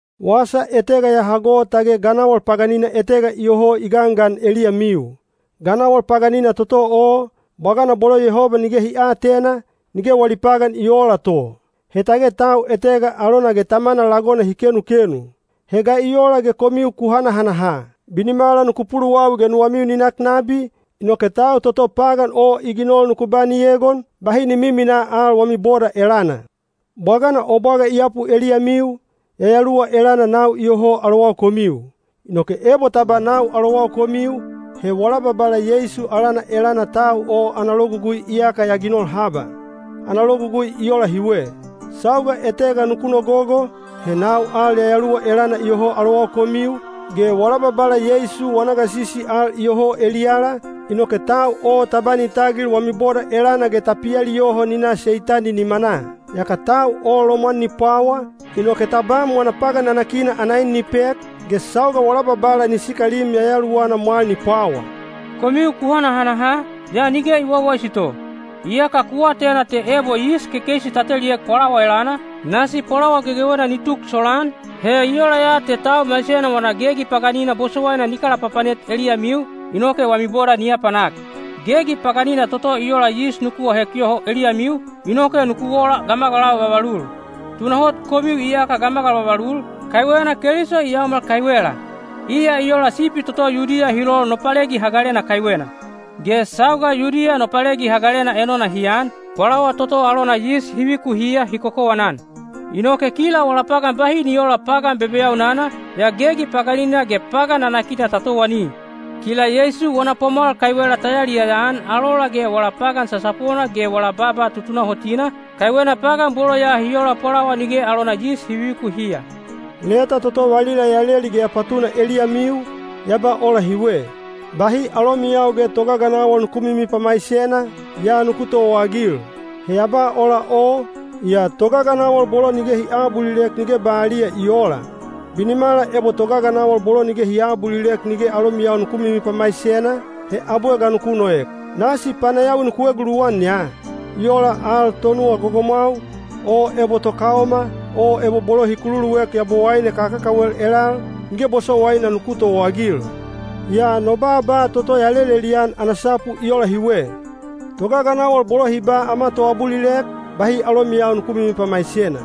Wasa etega ya hago tage ganawal paganina etega iyoho i gangan eliyamiu. Ganawal paganina toto o, bwagana bolo Yehoba nige hi aatena, nige wali pagan i oola to. He tage tau etega alona ge tamana lagona hi kenukenu. He ga i ola ge komiu ku hanahanaha? Binimala nuku puluwawi ge nuwamiu ni nak nabi, inoke tau toto pagan o i ginol nuku ba ni egon, bahi ni miminaa al wami boda elana. Bwagana o bwaga i yapu eliyamiu, yayaluwa elana nau iyoho alowau komiu. Inoke ebo ta ba nau alowau komiu, he wala Babala Yeisu alana elana tau o ana logugui iyaka ya ginol haba. Ana logugui i ola hiwe: sauga etega nuku nogogo, he nau al yayaluwa elana iyoho alowau komiu, ge wala Babala Yeisu wana gasisi al iyoho eliyala, inoke tau o ta ba ni tagil wami boda elana ge ta pialiyoho ni na Seitani nimanaa. Yaka tau o lomwan ni pwawa, inoke tabam wana pagan nanakina ana en ni pek, ge sauga wala Babala ni sikalim yayaluwana mwal ni pwawa. Komiu ku hanahanaha, yaa nige i wawaisi to! Iyaka ku atena te ebo yis kekeisi ta teliek pwalawa elana, nasi pwalawa gegewena ni tuk solaan, inoke pwalawa ni pouha. He i ola ya te tau maisena wana gegi paganina bosowaina ni kalapapanet eliyamiu, inoke wami boda ni apanak. Gegi paganina toto i ola yis nuku ahek yoho eliyamiu, inoke nuku ola gamagalau vavalul. Tunahot komiu iyaka gamagalau vavalul, kaiwena Keliso i yaomal kaiwela. Iya i ola sipi toto Yudiya hi lol Nopalegi Hagalena kaiwena. Ge sauga Yudiya Nopalegi Hagalena enona hi an, pwalawa toto alona yis hi vikuhiya hi kokowanan. Inoke kila wala pagan bahi ni oola pagan bebeyaunana, yaa gegi paganina ge pagan nanakina ta towani. Kila Yeisu wana pwamwal kaiwela ta yaliyaya-an alola ge wala pagan sasapona ge wala baaba tutunahotina, kaiwena pagan bolo ya hi ola pwalawa nige alona yis hi vivikuhiya. Leta toto valila ya leli ge ya patuna eliyamiu, ya ba ola hiwe: “Bahi alomiyau ge togaganawal nuku mimipamaisena, yaa nuku towaagil.” He ya ba ola o, yaa togaganawal bolo nige hi aabulilek nige baliya i oola. Binimala ebo togaganawal bolo nige hi aabulilek nige alomiyau nuku mimipamaisena, he abwe ga nuku noek? Nasi panayawi nuku eguluwan ya! I ola al tonuwa gogomwau, o ebo tokaoma, o ebo bolo hi kukululuek yabowaine kakakawel elal, nige bosowaina nuku towaagil. Yaa no baaba toto ya lelelian ana sapu i ola hiwe: togaganawal bolo hi ba “Ama toabulilek,” bahi alomiyau nuku mimipamaisena.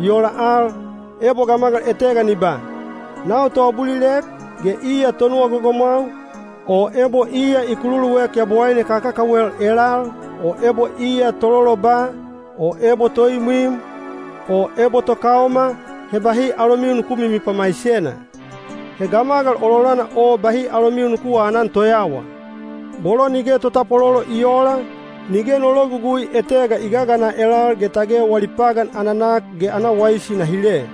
I ola al, ebo gamagal etega ni ba, “Nau toabulilek,” ge iya tonuwa gogomwau, o ebo iya i kululuek yabowaine kakakawel elal, o ebo iya tololoba, o ebo toimwim, o ebo tokaoma, he bahi alomiu nuku mimipamaisena. He gamagal ololana o bahi alomiu nuku aanan toyawa. Bolo nige totapwalolo i oola, nige no logugui etega i gagana elal ge tage wali pagan ana nak ge ana waisi na hile.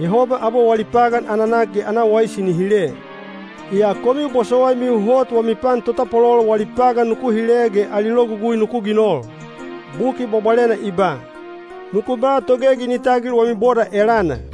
Yehoba abwe wali pagan ana nak ge ana waisi ni hile. Yaa komiu bosowaimiu hot wami pan totapwalolo wali pagan nuku hile ge ali logugui nuku ginol. Buki Bwabwalena i ba, “Nuku ba togegi ni tagil wami boda elana.”